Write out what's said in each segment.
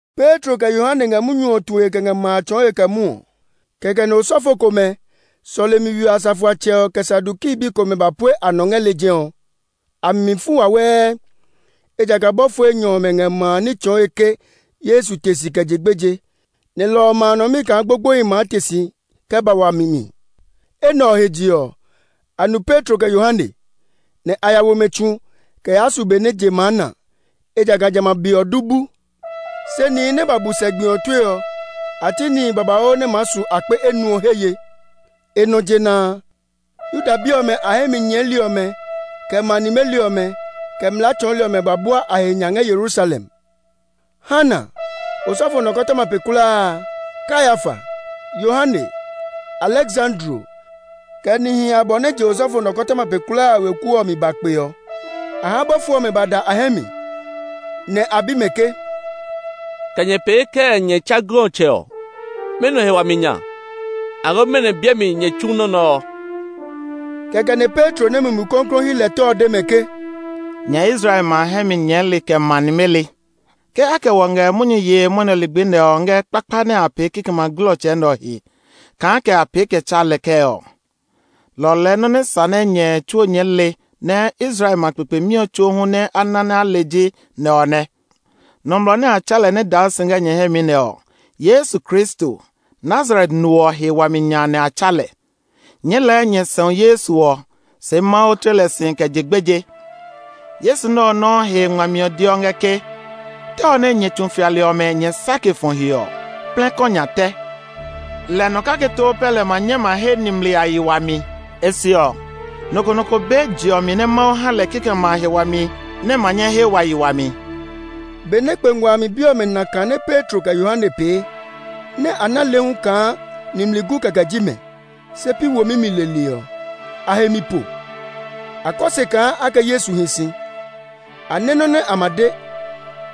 Petro kɛ Yohane ngɛ munyu ɔ tue kɛ ngɛ ma a tsɔɔe kɛ mwɔɔ, kɛkɛ nɛ osɔfo komɛ, sɔlemi we ɔ asafoatsɛ ɔ, kɛ Saduki bi komɛ ba pue a nɔ ngɛ lejɛ ɔ. A mi mi fu wawɛɛ, ejakaa bɔfo enyɔ ɔmɛ ngɛ ma a ní tsɔɔe ke Yesu te si kɛ je gbeje, nɛ lɔ ɔ maa nɔ mi kaa gbogboehi maa te si kɛ ba wami mi. Enɛ ɔ he je ɔ, a nu Petro kɛ Yohane; nɛ a ya wo mɛ tsu kɛ yaa su be nɛ je maa na, ejakaa jamɛ a be ɔ du bu. Se nihi nɛ ba bu sɛ gbi ɔ tue ɔ, a ti nihi babauu nɛ maa su akpe enuɔ he ye. E nɔ jena a, Yuda bi ɔmɛ a hɛ mi nyɛɛli ɔmɛ, kɛ ma nimeli ɔmɛ, kɛ mlaa tsɔɔli ɔmɛ ba bua a he nya ngɛ Yerusalem. Hana, osɔfo nɔkɔtɔma pe kulaa a, Kayafa, Yohane, Aleksandro, kɛ nihi abɔ nɛ je osɔfo nɔkɔtɔma pe kulaa a weku ɔ mi ba kpe ɔ. A ha bɔfo ɔmɛ ba da a hɛ mi, nɛ a bi mɛ ke, “Kɛ nyɛ pee kɛɛ nɛ nyɛ tsa glɔtsɛ ɔ? Mɛnɔ he wami nya, aloo mɛnɔ biɛ mi nyɛ tsu nɔ́ nɛ ɔ?” Kɛkɛ nɛ Petro nɛ Mumi Klɔuklɔu hyi lɛ tɔ ɔ de mɛ ke, “Nyɛ Israel ma hɛ mi nyɛɛli, kɛ ma nimeli, ke a kɛ wɔ ngɛ munyu yee mwɔnɛ ligbi nɛ ɔ ngɛ kpakpa nɛ a pee kikɛmɛ a glɔtsɛ nɛ ɔ he, kaa kɛ a pee kɛ tsa lɛ kɛɛ ɔ, lɔ ɔ lɛɛ nɔ́ nɛ sa nɛ nyɛ tsuo nyɛɛ le, nɛ Israel ma kpekpemi ɔ tsuo hu nɛ na nɛ a le ji nɛ ɔ nɛ. Nɔmlɔ nɛ a tsa lɛ nɛ daa si ngɛ nyɛ hɛ mi nɛ ɔ, Yesu Kristo, Nazaret no ɔ he wami nya nɛ a tsa lɛ. Nyɛɛ lɛɛ nyɛ sɛu Yesu ɔ, se Mawu tle lɛ si kɛ je gbeje. Yesu nɛ ɔ nɔuu he ngmami ɔ deɔ ngɛ ke, ‘Tɛ ɔ nɛ nyɛ tsu fiali ɔmɛ nyɛ sake fɔ he ɔ plɛ kɔ nya tɛ.’ Lɛ nɔ kake too pɛ lɛ ma nyɛ ma he nimli a yi wami. E se ɔ, nɔ ko nɔ ko be je ɔ mi nɛ Mawu ha lɛ kikɛmɛ a he wami nɛ ma nyɛ he wa yi wami.” Benɛ kpe ngua a mi bi ɔmɛ na kã nɛ Petro kɛ Yohane pee, nɛ a ná le hu kaa nimli gu kɛkɛ ji mɛ, se pi womi mi leli ɔ, a he mi po. A kɔ se kaa a kɛ Yesu hi si. A nɛ́ nɔ́ nɛ a ma de,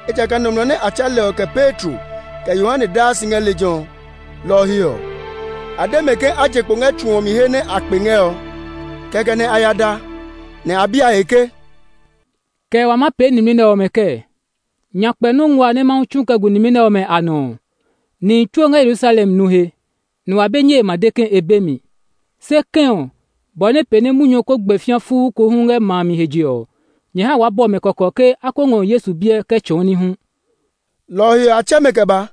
ejakaa nɔmlɔ nɛ a tsa lɛ ɔ kɛ Petro, kɛ Yohane daa si ngɛ lejɛ ɔ. Lɔ ɔ he ɔ, a de mɛ ke a je kpo ngɛ tsu ɔ mi he nɛ a kpe ngɛ ɔ. Kɛkɛ nɛ a ya da, nɛ a bi a he ke, “Kɛ wa maa pee nimli nɛ ɔmɛ kɛɛ? Nyakpɛ nɔ́ nguaa nɛ Mawu tsu kɛ gu nimli nɛ ɔmɛ a nɔ ɔ, nihi tsuo ngɛ Yerusalem nu he; nɛ wa be nyɛe ma de ke e be mi. Se kɛ̃ ɔ, bɔ nɛ pee nɛ munyu ɔ ko gbɛ fĩa fuu ko hu ngɛ ma a mi he je ɔ, nyɛ ha waa bɔ mɛ kɔkɔ ke a ko ngɔ Yesu biɛ kɛ tsɔɔ ní hu.” Lɔ ɔ he ɔ, a tsɛ mɛ kɛ ba,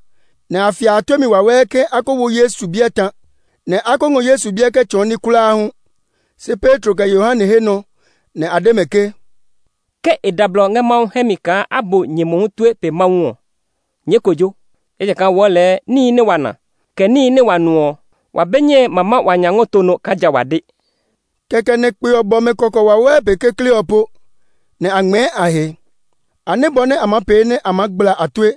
nɛ a fia a tue mi wawɛɛ ke a ko wo Yesu biɛ ta, nɛ a ko ngɔ Yesu biɛ kɛ tsɔɔ ní kulaa hu. Se Petro kɛ Yohane he nɔ nɛ a de mɛ ke, “Ke e da blɔ ngɛ Mawu hɛ mi kaa a bu nyɛ mohu tue pe Mawu ɔ, nyɛɛ kojo. Ejakaa wɔɔ lɛɛ, níhi nɛ wa na, kɛ níhi nɛ wa nu ɔ, wa be nyɛe ma ma wa nya ngɔ to nɔ kaa ja wa de.” Kɛkɛ nɛ kpe ɔ bɔ mɛ kɔkɔ wawɛɛ pe kekle ɔ po, nɛ a ngmɛɛ a he. A nɛ́ bɔ nɛ a maa pee nɛ a maa gbla a tue;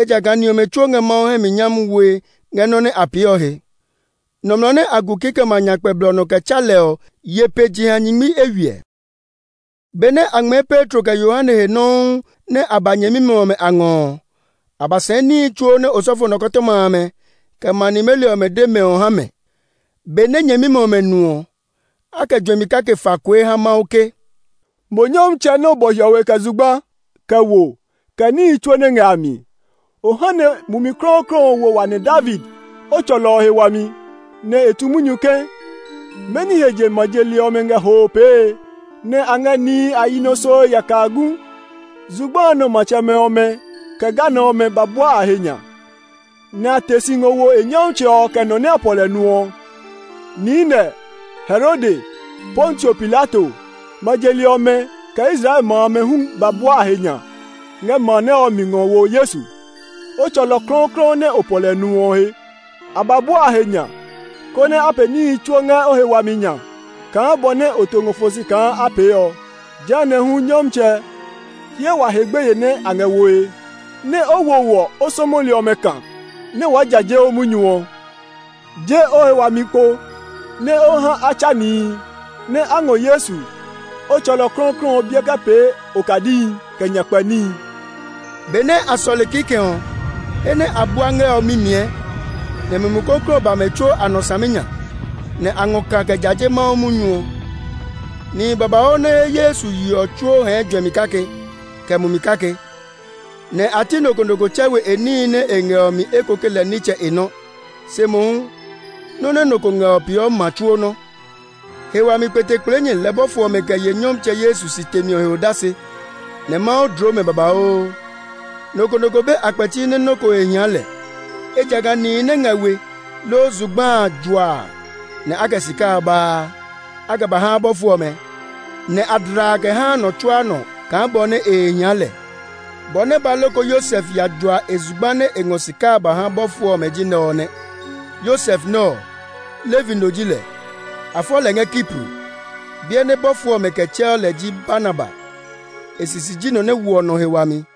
ejakaa ni ɔmɛ tsuo ngɛ Mawu hɛ mi nyami woe ngɛ nɔ́ nɛ a pee ɔ he. Nɔmlɔ nɛ a gu kikɛmɛ a nyakpɛ blɔ nɔ kɛ tsa lɛ ɔ ye pe jeha nyingmi eywiɛ. Benɛ a ngmɛɛ Petro kɛ Yohane he nɔuu nɛ a ba nyɛmimɛ ɔmɛ a ngɔ ɔ, a ba sɛɛ níhi tsuo nɛ osɔfo nikɔtɔma amɛ, kɛ ma nimeli ɔmɛ de mɛ ɔ ha mɛ. Benɛ nyɛmimɛ ɔmɛ nu ɔ, a kɛ juɛmi kake fa kue ha Mawu ke, “Mo Nyɔmtsɛ nɛ o bɔ hiɔwe kɛ zugba, kɛ wo, kɛ níhi tsuo nɛ ngɛ a mi. O ha nɛ Mumi Klɔuklɔu ɔ wo wa nɛ̃ David, o tsɔlɔ ɔ he wami, nɛ e tu munyu ke, ‘Mɛni he je ma je li ɔmɛ ngɛ hoo pee, nɛ a ngɛ nihi a yi nɔ soe yaka gu? Zugba a nɔ matsɛmɛ ɔmɛ, kɛ ganɔ ɔmɛ ba bua a he nya; nɛ a te si ngɔ wo e nyɔmtsɛ ɔ kɛ nɔ nɛ a pɔ lɛ nu ɔ.’ Niinɛ, Herode, Pontio Pilato, ma je li ɔmɛ, kɛ Israel ma amɛ hu ba bua a he nya ngɛ ma nɛ ɔ mi ngɔ wo Yesu, o tsɔlɔ klɔuklɔu nɛ o pɔ lɛ nu ɔ he. A ba bua a he nya, konɛ a pee níhi tsuo ngɛ o he wami nya kaa bɔ nɛ o to ngɔ fɔ si kaa a pee ɔ. Jehanɛ hu Nyɔmtsɛ, hyɛ wa he gbeye nɛ a ngɛ woe ɔ, nɛ o wo wɔ, o sɔmɔli ɔmɛ kã nɛ waa jaje o munyu ɔ. Je o he wami kpo, nɛ o ha a tsa nihi, nɛ a ngɔ Yesu, o tsɔlɔ klɔuklɔu ɔ biɛ kɛ pee okadihi, kɛ nyakpɛ níhi.” Benɛ a sɔle kikɛ ɔ, he nɛ a bua ngɛ ɔ mimiɛ, nɛ Mumi Klɔuklɔu ɔ ba mɛ tsuo a nɔ saminya, nɛ a ngɔ kã kɛ jaje Mawu munyu ɔ. Nihi babauu nɛ he Yesu ye ɔ tsuo hɛɛ juɛmi kake, kɛ mumi kake. Nɛ a ti nɔ ko nɔ ko tsɛ we e níhi nɛ e ngɛ ɔ mi eko ke lɛ nitsɛ e nɔ́, se mohu, nɔ́ nɛ nɔ ko ngɛ ɔ peeɔ ma tsuo nɔ́. He wami kpetekpleenyɛ lɛ bɔfo ɔmɛ kɛ ye Nyɔmtsɛ Yesu si temi ɔ he odase, nɛ Mawu dloo mɛ babauu. Nɔ ko nɔ ko be a kpɛti nɛ nɔ́ ko he hia lɛ, ejakaa nihi nɛ ngɛ we, loo zugba a juaa, nɛ a kɛ sika a baa. A kɛ ba haa bɔfo ɔmɛ, nɛ a dlaa kɛ haa nɔ tsuaa nɔ kaa bɔ nɛ he hia lɛ. Bɔ nɛ ba loko Yosef ya jua e zugba nɛ e ngɔ sika a ba ha bɔfo ɔmɛ ji nɛ ɔ nɛ. Yosef nɛ ɔ, Levi no ji lɛ; a fɔ lɛ ngɛ Kipro. Biɛ nɛ bɔfo ɔmɛ kɛ tsɛɔ lɛ ji Barnaba. E sisi ji nɔmlɔ nɛ woɔ nɔ he wami.